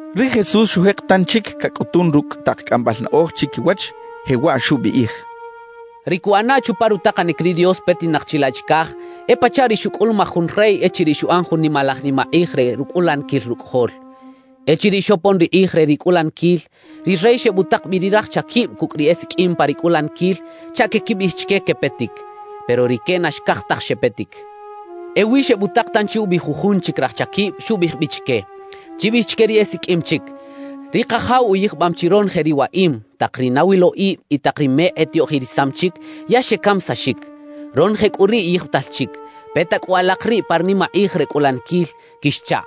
Ri Jesús xujek tanchic cacꞌutun rucꞌ tak cꞌambal naꞌoj chiquiwach, jewaꞌ xubiꞌij: «Ri cuꞌana chupa rutakanic ri Dios petinak chilaꞌ chicaj e pachaꞌ ri xucꞌulumaj jun rey echiriꞌ xuꞌan jun nimalaj nimakꞌij re rucꞌulaniquil rucꞌajol. »Echiriꞌ xopon ri kꞌij re ri cꞌulaniquil, ri rey xebutak bi ri raj chaquib cucꞌ ri esiqꞌuim pa ri cꞌulaniquil chaꞌ queꞌquibiꞌij chique quepetic, pero rique na xcaj taj xepetic. »Ewi xebutak tanchi ubi jujun chic raj chaquib, xubiꞌij bi chique: “Chibiꞌij chique ri esiqꞌuim chic: Ri kajaw uyijbam chi ronoje ri waꞌim; tak ri nawiloꞌib y tak ri mekꞌ etiꞌoꞌjirisam chic, ya xecamisaxic. Ronoje cꞌu riꞌ yijbital chic. Peta cꞌu alak riꞌ pa ri nimakꞌij re cꞌulaniquil” quixchaꞌ.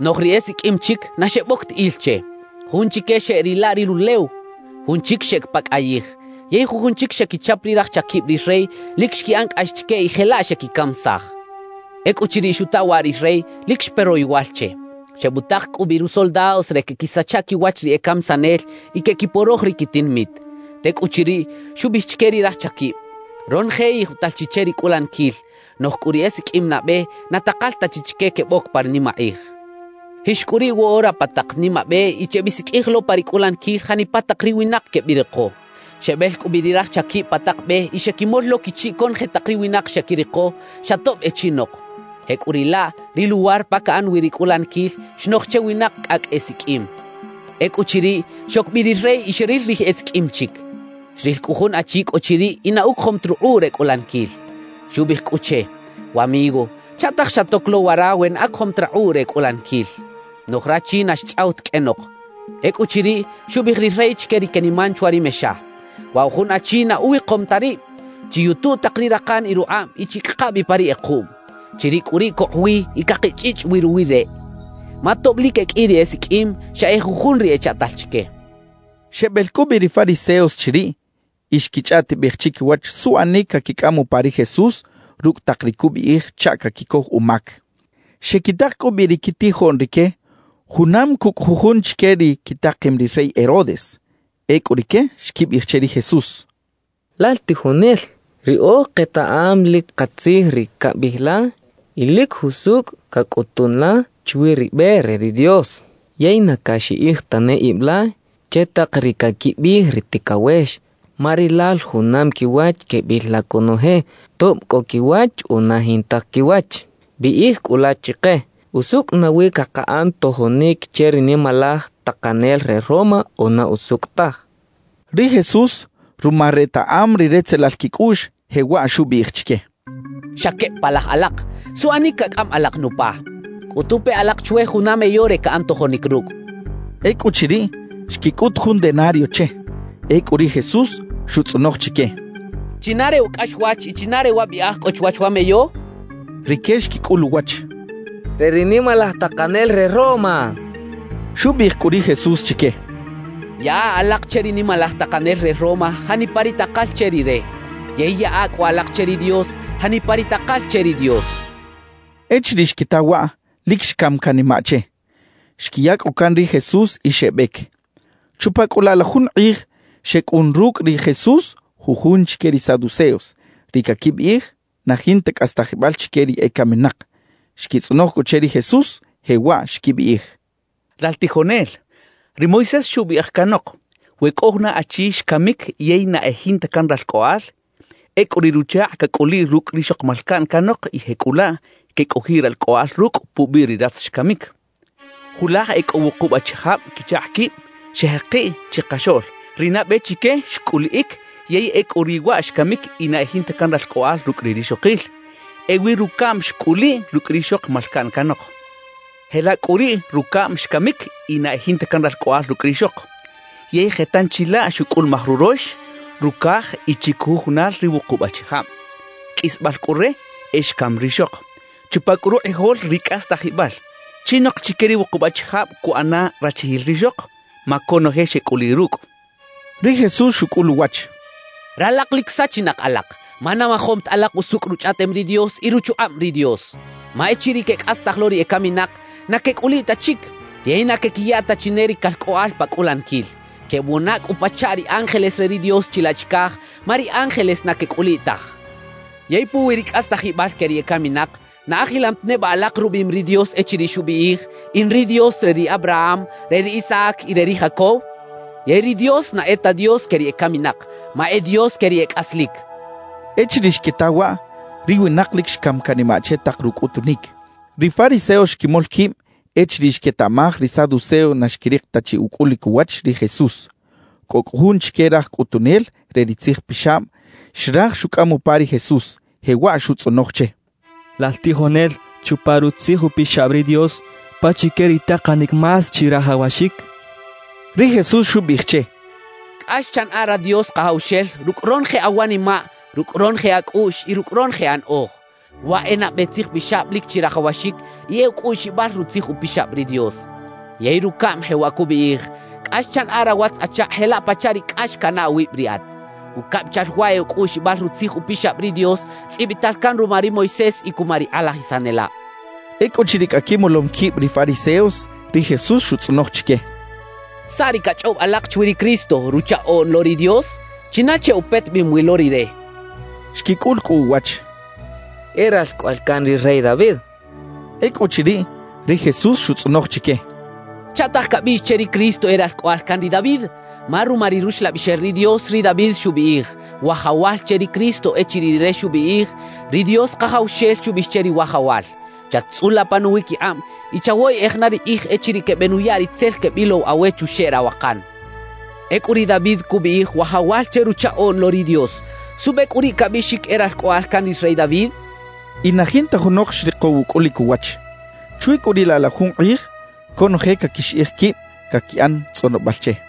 »Noꞌj ri esiqꞌuim chic, na xeboc ta il che. Jun chique xeꞌrila ri rulew, jun chic xeꞌec pa cꞌayij. Yey jujun chic xequichap ri raj chaquib ri rey, lic xquiꞌan cꞌax chique y jelaꞌ xequicamisaj. »Ecꞌuchiriꞌ xuta waꞌ ri rey, lic xpe royowal che. Xebutak cꞌu bi rusoldados re queꞌquisacha quiwach ri e camisanel y queꞌquiporoj ri quitinamit. »Tecꞌuchiriꞌ, xubiꞌij chique ri raj chaquib: “Ronoje yijbital chi che ri cꞌulaniquil; noꞌj cꞌu ri esiqꞌuim nabe, na takal ta chi chique queboc pa ri nimakꞌij. Jix cꞌu riꞌ woꞌora pa tak nimabe y chebisiqꞌuij lo pa ri cꞌulaniquil janipa tak ri winak quebiriko” xchaꞌ. »Xebel cꞌu bi ri raj chaquib pa tak be y xequimol lo quichiꞌ conoje tak ri winak xequiriko xa tob e chinok; jecꞌuriꞌlaꞌ ri luwar pa caꞌan wi ri cꞌulaniquil xnoj che winak cꞌacꞌ esiqꞌuim. Ecꞌuchiriꞌ, xoc bi ri rey y xeril ri esiqꞌuim chic. Xril cꞌu jun achi cꞌo chiriꞌ y na ucojom ta rukꞌuꞌ re cꞌulaniquil. »Xubiꞌij cꞌu che: “Wamigo, ¿chaꞌtaj xatoc lo wara we na acojom ta rakꞌuꞌ re cꞌulaniquil?” xchaꞌ. Noꞌj rachi na xchꞌaw ta qꞌuenok. »Ecꞌuchiriꞌ, xubiꞌij ri rey chique ri queniman chwa ri mexa: “Wa jun achi na uwikom ta rib, chiyutu tak ri rakan y rukꞌab y chicꞌaka bi pa ri kꞌekuꞌm. Chiriꞌ cꞌu riꞌ cokꞌ wi y cakichꞌichꞌ wi ruwi reꞌ” xchaꞌ. »Ma tob lic e qꞌui ri esiqꞌuim, xa e jujun ri echaꞌtal chique» xcha ri Jesús. Xebel cꞌu bi ri fariseos chiriꞌ y xquichꞌaꞌtibej chiquiwach suꞌanic caquicꞌam upa ri Jesús rucꞌ tak ri cubiꞌij chaꞌ caquicoj umac. Xequitak cꞌu bi ri quitijoꞌn rique junam cucꞌ jujun chique ri quitakem ri rey Herodes. Ecꞌu rique xquibiꞌij che ri Jesús: —Lal tijonel, riꞌoj ketaꞌam lic katzij ri cabiꞌij la y lic jusucꞌ cacꞌutun la chwi ri be re ri Dios. Yey na caxiꞌij tane ib la che tak ri caquibiꞌij ri ticawex; ma rilal junam quiwach quebil la conoje, tob cꞌo quiwach o na jinta quiwach. Biꞌij cꞌu la chike: ¿Usucꞌ nawi cakaꞌan tojonic che ri nimalaj takanel re Roma o na usucꞌ taj? —xechaꞌ. Ri Jesús, ruma retaꞌam ri retzelal quicꞌuꞌx, jewaꞌ xubiꞌij chique: —¡Xa queb palaj alak! ¿Suꞌchac cacꞌam alak nupa? Cꞌutu pe alak chwe juna meyo re caꞌan tojonic rucꞌ —xchaꞌ. Ecꞌuchiriꞌ, xquicꞌut jun denario che. Ecꞌu ri Jesús xutzꞌonoj chique: —¿China re wa cꞌaxwach y china re wa biꞌaj cꞌo chwach wa meyo? —xchaꞌ. Rique xquicꞌul uwach: —Re ri nimalaj takanel re Roma —xechaꞌ. Xubiꞌij cꞌu ri Jesús chique: —Yaꞌa alak che ri nimalaj takanel re Roma janipa ri takal che rire, yey yaꞌa cꞌu alak che ri Dios janipa ri takal che ri Dios —xchaꞌ. Echiriꞌ xquita waꞌ, lic xcam canimaꞌ che. Xquiya cꞌu can ri Jesús y xebec. Chupa cꞌu laꞌ la jun kꞌij, xecꞌun rucꞌ ri Jesús jujun chique ri saduceos, ri caquibiꞌij na jinta cꞌastajibal chique ri ecaminak. Xquitzꞌonoj cꞌu che ri Jesús, jewaꞌ xquibiꞌij: —Lal tijonel, ri Moisés xubiꞌij canok: “We cꞌo juna achi xcamic yey na e jinta can ralcꞌoꞌal, ecꞌu riꞌ ruchakꞌ cacꞌuliꞌ rucꞌ rixok malcaꞌn canok y jecꞌulaꞌ quecꞌojiꞌ ralcꞌoꞌal rucꞌ pubiꞌ ri ratz xcamic” xchaꞌ. »Julaj e cꞌo wukub achijab quichakꞌ quib xejekiꞌ chikaxoꞌl. Ri nabe chique xcꞌuliꞌic yey ecꞌu riꞌ waꞌ xcamic y na e jinta can ralcꞌoꞌal rucꞌ ri rixokil. Ewi rucaꞌm xcꞌuliꞌ rucꞌ rixok malcaꞌn canok. Jelaꞌ cꞌu riꞌ rucaꞌm xcamic y na e jinta can ralcꞌoꞌal rucꞌ rixok. Yey je tanchi laꞌ xucꞌulumaj rurox, rucaj y chiquijujunal ri wukub achijab. Qꞌuisbal cꞌu re, e xcam rixok. »Chupa cꞌu rukꞌijol ri cꞌastajibal, ¿chinok chique ri wukub achijab cuꞌana rachijil rixok? Ma conoje xecꞌuliꞌ rucꞌ —xechaꞌ. Ri Jesús xucꞌul uwach: —Ralak lic sachinak alak, ma na majom ta alak usucꞌ Ruchꞌaꞌtem ri Dios y ruchukꞌab ri Dios. Ma echiriꞌ quecꞌastaj lo ri ecaminak, na quecꞌuliꞌ ta chic yey na quequiya ta chi ne ri calcꞌoꞌal pa cꞌulaniquil; quebuꞌana cꞌu pachaꞌ ri ángeles re ri Dios chilaꞌ chicaj, ma ri ángeles na quecꞌuliꞌ taj. Yey puwi ri cꞌastajibal que ri ecaminak, ¿na ajilam ta neba alak rubiꞌim ri Dios echiriꞌ xubiꞌij: “In ri Dios re ri Abraham, re ri Isaac y re ri Jacob”? Yey ri Dios na e ta Dios que ri ecaminak, ma e Dios que ri e cꞌaslic —xchaꞌ. Echiriꞌ xquita waꞌ, ri winak lic xcam canimaꞌ che tak rucꞌutunic. Ri fariseos xquimol quib echiriꞌ xquetaꞌmaj ri saduceos na xquirik ta chi ucꞌulic uwach ri Jesús. Cꞌo cꞌu jun chique raj cꞌutunel re ri tzijpixab xraj xucꞌam upa ri Jesús, jewaꞌ xutzꞌonoj che: —Lal tijonel, chupa Rutzij Upixab ri Dios, ¿pachique ri takanic más chirajawaxic? —xchaꞌ. Ri Jesús xubiꞌij che: —“Cꞌax chanaꞌa ra Dios Kajawxel rucꞌ ronoje awanimaꞌ, rucꞌ ronoje acꞌuꞌx y rucꞌ ronoje anaꞌoj.” Waꞌ e nabe tzijpixab lic chirajawaxic y e ucꞌuꞌxibal Rutzij Upixab ri Dios. Yey rucaꞌm jewaꞌ cubiꞌij: “Cꞌax chanaꞌa rawatz-achakꞌ jelaꞌ pachaꞌ ri cꞌax canaꞌ awib riꞌat.” Ucabichal waꞌ e ucꞌuꞌxibal Rutzij Upixab ri Dios tzꞌibital can ruma ri Moisés y cuma ri kꞌalajisanelab —xchaꞌ. Ecꞌuchiriꞌ cꞌa quimolom quib ri fariseos, ri Jesús xutzꞌonoj chique: —¿Saꞌ ri cachꞌob alak chwi ri Cristo, Ruchaꞌoꞌn lo ri Dios? ¿China che upetebem wi lo rire? —xchaꞌ. Xquicꞌul cꞌu uwach: —E ralcꞌoꞌal can ri rey David —xechaꞌ. Ecꞌuchiriꞌ, ri Jesús xutzꞌonoj chique: —¿Chaꞌtaj cabiꞌx che ri Cristo e ralcꞌoꞌal can ri David? Ma ruma ri Ruxlabixel ri Dios, ri David xubiꞌij “Wajawal” che ri Cristo echiriꞌ rire xubiꞌij: Ri Dios Kajawxel xubiꞌij che ri Wajawal: “Chat-tzꞌula pa nuwiquikꞌab, y chawoyeꞌej na ri kꞌij echiriꞌ quebenuya ri tzel quebilow awe chuxeꞌ rawakan” xchaꞌ. Ecꞌu ri David cubiꞌij “Wajawal” che Ruchaꞌoꞌn lo ri Dios. ¿Suꞌbe cꞌu riꞌ cabiꞌxic e Ralcꞌoꞌal can ri rey David? —xchaꞌ. Y na jinta junok xrikow ucꞌulic uwach. Chwi cꞌu riꞌ laꞌ la jun kꞌij, conoje caquixiꞌij quib caquiꞌan tzꞌonobal che.